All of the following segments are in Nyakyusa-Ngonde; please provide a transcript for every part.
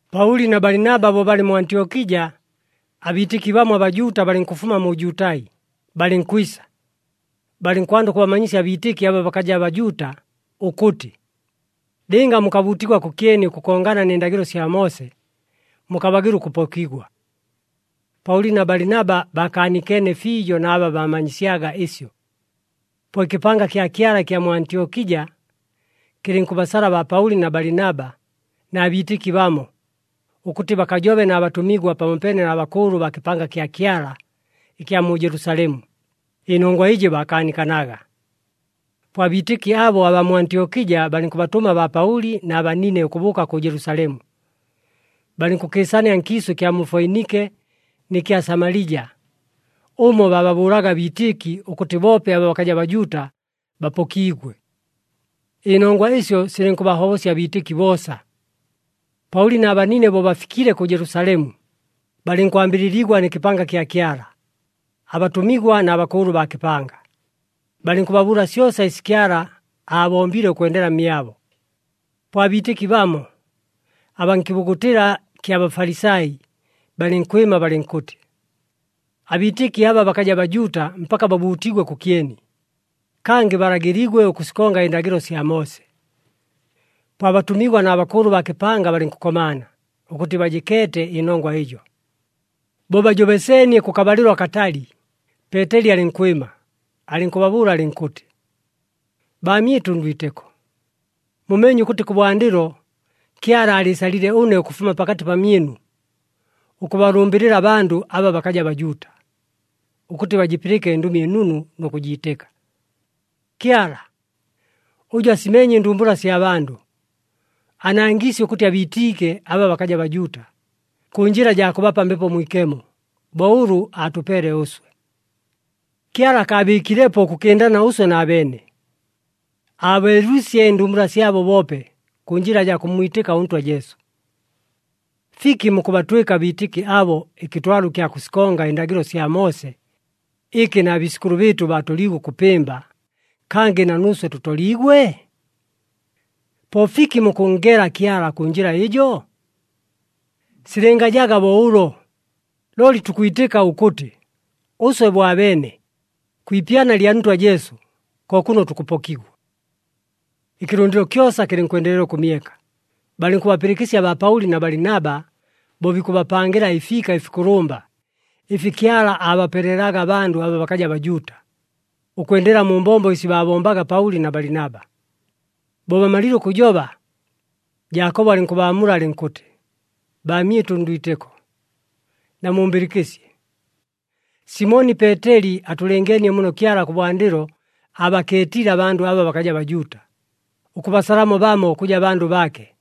Paʉli na Balinaba bo balɨ mu Antyokija, abiitɨki bamo aBajuuta balɨnkʉfuma mu Jutai, balɨnkwisa, balɨnkwanda ʉkʉbamanyisya abiitɨki aba bakaja Bajuuta ʉkʉtɨ, “Lɨnga mukabuutigwa kʉkyeni ʉkʉkongana nɨ ndagɨlo sya Moose, mukabagɨla ʉkʉpokigwa.” Paʉli na Balinaba baakaanikeene fiijo na aba baamanyisyaga ɨsyo. Po ɨkɨpanga kya Kyala ɨkya mu Antyokija, kɨlɨnkʉbasala baa Paʉli na Balinaba na biitɨki bamo, ʉkʉtɨ bakajobe na batʉmigwa pamopeene na bakʉʉlʉ baa kɨpanga kya Kyala ɨkya mu Jelusalemu, ɨnongwa ɨjɨ baakaanikanaga. Po abiitɨki abo abaa mu Antyokija balɨnkʉbatʉma baa Paʉli na banine ʉkʉbʉʉka kʉ Jelusalemu. Balɨnkʉkɨɨsania nkiisʉ ɨkya mu Foinike nɨ kya Samalija, ʉmo baababʉʉlaga abiitɨki ʉkʉtɨ boope aba bakaja Bajuuta bapokiigwe. Ɨnongwa ɨsyo silɨnkʉbahobosya abiitɨki boosa. Paʉli na banine bo bafikile kʉ Jelusalemu, balɨnkwambɨlɨligwa nɨ kɨpanga kya Kyala, abatʉmigwa na bakʉʉlʉ baa kɨpanga. Balɨnkʉbabʉʉla syosa ɨsi Kyala aabombile ʉkwendela mmyabo. Po abiitɨki bamo, abaa nkɨbugutɨla kya Bafalisai, balɨnkwɨma balɨnkʉtɨ, “Abiitɨki aba bakaja Bajuuta mpaka babuutigwe kʉkyeni, kangɨ balagɨligwe ʉkʉsikonga ɨndagɨlo sya Moose.” Po abatʉmigwa na bakʉʉlʉ baa kɨpanga balɨnkʉkomaana, ʉkʉtɨ bajɨkeete ɨnongwa ɨjo. Bo bajobeseenie kʉkabalɨlo akatali, Peeteli alɨnkwɨma, alɨnkʉbabʉʉla alɨnkʉtɨ, “Baamyɨtʉ ndwitɨko, mumeenye ʉkʉtɨ kʉbwandɨlo, Kyala aalɨɨsalile ʉne ʉkʉfuma pakatɨ pamyɨnu, ʉkʉbalʉmbɨlɨla abandʉ aba bakaja Bajuuta, ʉkʉtɨ bajɨpɨlɨke ɨNdʉmi ɨNunu nʉ kʉjiitɨka. Kyala, ʉjʉ asimeenye ɨndumbula sya bandʉ, aanangiisye ʉkʉtɨ abiitiike aba bakaja Bajuuta, kʉ njɨla jaa kʉbapa Mbepo Mwikemo, bo ʉlʉ aatʉpeele ʉswe. Kyala akaabɨɨkilepo ʉkʉkɨndana ʉswe na beene, aabeelwisye ɨndumbula syabo boope, kʉ njɨla jaa kʉmmwitɨka ʉNtwa Jesu. Fiki mukʉbatwɨka abiitɨki abo ɨkɨtwalo ɨkya kʉsikonga ɨndagɨlo sya Moose, ɨkɨ na biisʉkʉlʉ bɨɨtʉ baatoliigwe ʉkʉpɨmba, kangɨ na nuuswe tʉtoliigwe? Po fiki mukʉnngela Kyala kʉ njɨla ɨjo? Silɨngajaga bo ʉlo, looli tukwitɨka ʉkʉtɨ ʉswe bo abeene, kwi ipyana lya Ntwa Jesu ko kʉno tukʉpokigwa.” Ɨkɨlʉndɨlo kyosa kɨlɨnkwendelela ʉkʉmyeka, balɨnkʉbapɨlɨkɨsya baa Paʉli na Balinaba, bo bikʉbapangɨla ɨfiika ɨfikʉlʉmba, ɨfi Kyala aabapelelaga abandʉ aba bakaja Bajuuta, ʉkwendela mu mbombo ɨsi baabombaga Paʉli na Balinaba. Bo bamalile ʉkʉjoba, Jaakobo alɨnkʉbaamula alɨnkʉtɨ, “Baamyɨtʉ ndwitɨko, namumbɨlɨkɨsye! Simoni Peeteli atʉlɨngeenie muno Kyala kʉbwandɨlo aabakeetile abandʉ aba bakaja Bajuuta, ʉkʉbasalamo bamo ʉkʉja bandʉ baake.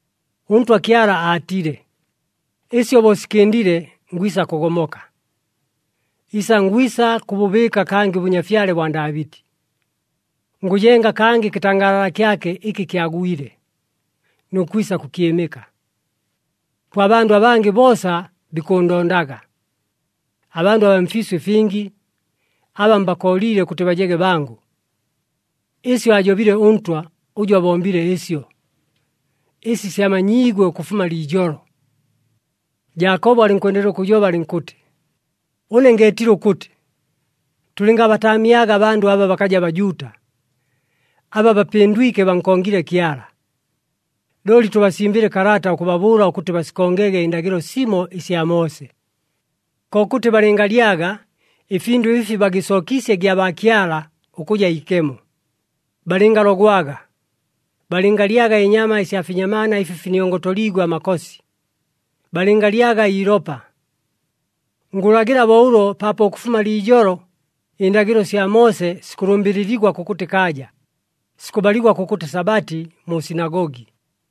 ‘ɄNtwa Kyala aatile, “Ɨsyo bo sikɨndile, ngwisa kʉgomoka, isangwisa kʉbʉbɨɨka kangɨ ʉbʉnyafyale bwa Ndaabɨti. Ngʉjenga kangɨ ɨkɨtangaalala kyake ɨkɨ kyagwile, nʉ kwisa kʉkyɨmɨka. Po abandʉ abangɨ boosa bikʉʉndondaga, abandʉ abaa mfiisʉ ɨfingi, aba mbakooliile ʉkʉtɨ bajege bangʉ.” Ɨsyo ajobile ʉNtwa, ʉjʉ abombile ɨsyo,’ ɨsi syamanyiigwe ʉkʉfuma liijolo.” Jaakobo alɨnkwendelela ʉkʉjoba alɨnkʉtɨ, “Ʉne ngeetile ʉkʉtɨ, tʉlɨngabataamyaga abandʉ aba bakaja Bajuuta, aba bapɨndwike, bankongile Kyala. Looli tʉbasimbɨle kalata ʉkʉbabʉʉla ʉkʉtɨ basikongege ɨndagɨlo simo ɨsya Moose. Kokʉtɨ balɨngalyaga ɨfindʉ ɨfi bagɨsookiisye gyabaakyala ʉkʉja ikemo, balɨngalogwaga, balɨngalyaga ɨnyama ɨsya finyamaana ɨfi finiongotoliigwe amakosi, balɨngalyaga iilopa. Ngʉlagɨla bo ʉlo paapo ʉkʉfuma liijolo ɨndagɨlo sya Moose sikʉlʉmbɨlɨligwa kʉkʉtɨ kaaja, sikʉbaligwa kʉkʉtɨ Sabati mu sinagogi.”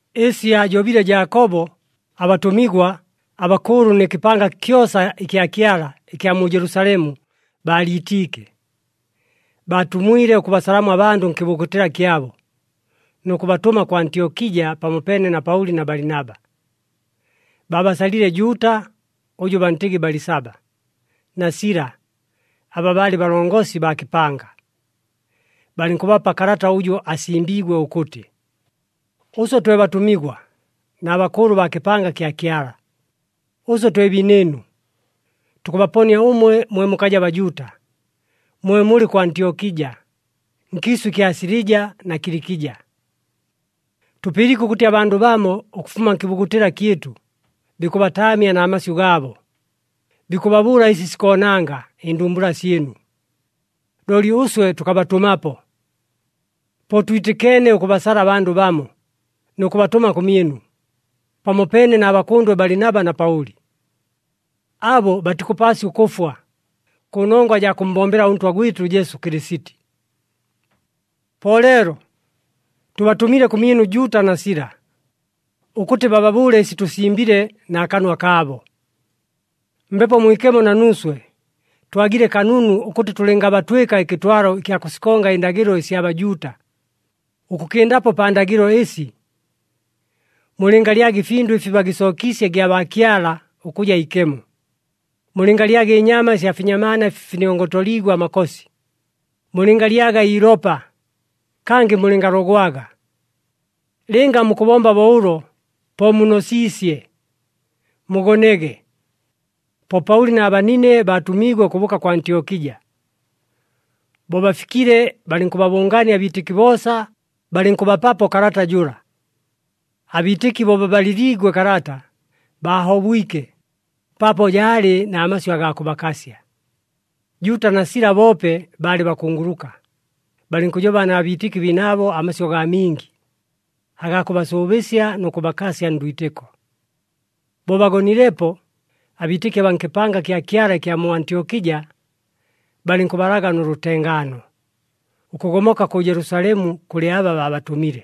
Ɨsi aajobile Jaakobo, abatʉmigwa, abakʉʉlʉ nɨ kɨpanga kyosa ɨkya Kyala ɨkya mu Jelusalemu baaliitiike. Baatumwile ʉkʉbasalamo abandʉ nkɨbugutɨla kyabo, nʉ kʉbatʉma kʉ Antyokija pamopeene na Paʉli na Balinaba. Baabasalile Juuta (ʉjʉ bantɨgɨ Balisaba) na Sila, aba baalɨ balongosi baa kɨpanga. Balɨnkʉbapa kalata ʉjʉ asimbiigwe ʉkʉtɨ, Ʉswe twe batʉmigwa na bakʉʉlʉ baa kɨpanga kya Kyala, ʉswe twe biinɨɨnu, tukʉbaponia ʉmwe mwe mukaja Bajuuta, mwe mulɨ kʉ Antyokija, nkiisʉ ɨkya Silija na Kilikija. Tʉpɨliike ʉkʉtɨ abandʉ bamo, ʉkʉfuma nkɨbugutɨla kyɨtʉ, bikʉbataamya na masyʉ gaabo, bikʉbabʉʉla ɨsi sikoonanga ɨndumbula syɨnu. Looli ʉswe tʉkabatʉmapo. Po twitɨkeene, ʉkʉbasala abandʉ bamo, nʉ kʉbatʉma kʉmyɨnu, pamopeene na bakʉndwe Balinaba na Paʉli. Abo batikʉpaasya ʉkʉfwa, kʉnongwa jaa kʉmmbombela ʉNtwa gwɨtʉ Jesu Kɨlɨsiti. Po leelo tʉbatʉmile kʉmyɨnu Juuta na Sila, ʉkʉtɨ bababʉʉle ɨsi tʉsimbile, na kanwa kaabo. Mbepo Mwikemo na nuuswe, twagile kanunu ʉkʉtɨ tʉlɨngabatwɨka ɨkɨtwalo ɨkya kʉsikonga ɨndagɨlo ɨsya Bajuuta, ʉkʉkɨndapo pa ndagɨlo ɨsi: Mulɨngalyaga ɨfindʉ ɨfi bagɨsookiisye gyabaakyala ʉkʉja ikemo, mulɨngalyaga ɨnyama ɨsya finyamaana ɨfi finiongotoliigwe amakosi, mulɨngalyaga iilopa, kangɨ mulɨngalogwaga. Lɨnga mukʉbomba bo ʉlo po munosiisye. Mugonege! Po Paʉli na banine baatʉmiigwe ʉkʉbʉʉka kʉ Antyokija. Bo bafikile, balɨnkʉbabʉngaania abiitɨki boosa, balɨnkʉbapapo kalata jʉla. Abiitɨki bo babalɨliigwe kalata, baahobwike paapo jaalɨ na masyʉ agaa kʉbakasya. Juuta na Sila, boope baalɨ bakunguluka, balɨnkʉjoba na biitɨki biinaabo amasyʉ gaa mingi, agaa kʉbasʉʉbɨsya nʉ kʉbakasya ndwitɨko. Bo bagonilepo, abiitɨki abaa nkɨpanga kya Kyala ɨkya mu Antyokija balɨnkʉbalaga nʉ lʉtengaano, ʉkʉgomoka kʉ Jelusalemu kʉlɨ aba baabatʉmile. [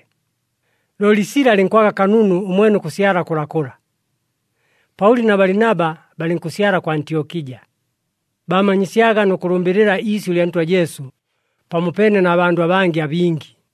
Looli Sila alɨnkwaga kanunu ʉmwene ʉkʉsyala kʉlakʉla.] Paʉli na Balinaba balɨnkʉsyala kʉ Antyokija, baamanyisyaga nʉ kʉlʉmbɨlɨla iisyʉ lya Ntwa Jesu, pamopeene na bandʉ abangɨ abingi.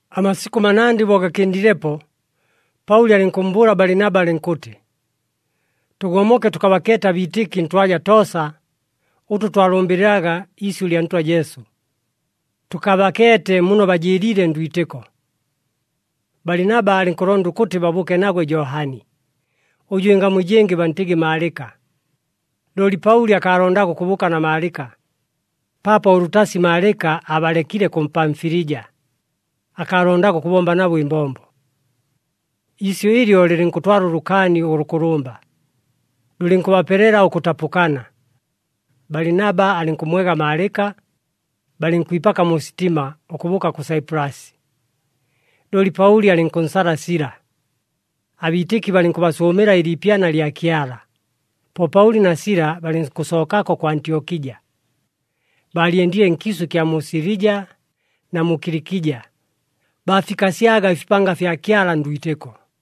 Amasikʉ manandɨ bo gakɨndilepo, Paʉli alɨnkʉmmbʉʉla Balinaba alɨnkʉtɨ, “Tʉgomoke tʉkabakeete abiitɨki ntwaja toosa, ʉtʉ twalʉmbɨlɨlaga iisyʉ lya Ntwa Jesu, tʉkabakeete muno bajɨɨliile ndwitɨko.” Balinaba alɨnkʉlonda ʉkʉtɨ babʉʉke nagwe Johani, ʉjʉ ɨngamu ɨjɨngɨ bantɨgɨ Maalɨka. Looli Paʉli akaalondaga ʉkʉbʉʉka na Maalɨka, paapo ʉlʉtasi Maalɨka aabalekile kʉ Pamfilija, akaalondaga ʉkʉbomba nabo ɨmbombo. Iisyʉ ɨlyo lɨlɨnkʉtwala ʉlʉkaani ʉlʉkʉlʉmba, lʉlɨnkʉbapelela ʉkʉtapʉkana. Balinaba alɨnkʉmmwega Maalɨka, balɨnkwipaka mu sitima, ʉkʉbʉʉka kʉ Saipulasi. Looli Paʉli alɨnkʉnsala Sila. Abiitɨki balɨnkʉbasʉʉmɨla ɨliipyana lya Kyala, po Paʉli na Sila balɨnkʉsookako kʉ Antyokija. Baalyendile nkiisʉ ɨkya mu Silija na mu Kilikija, baafikasyaga ɨfipanga fya Kyala ndwitɨko.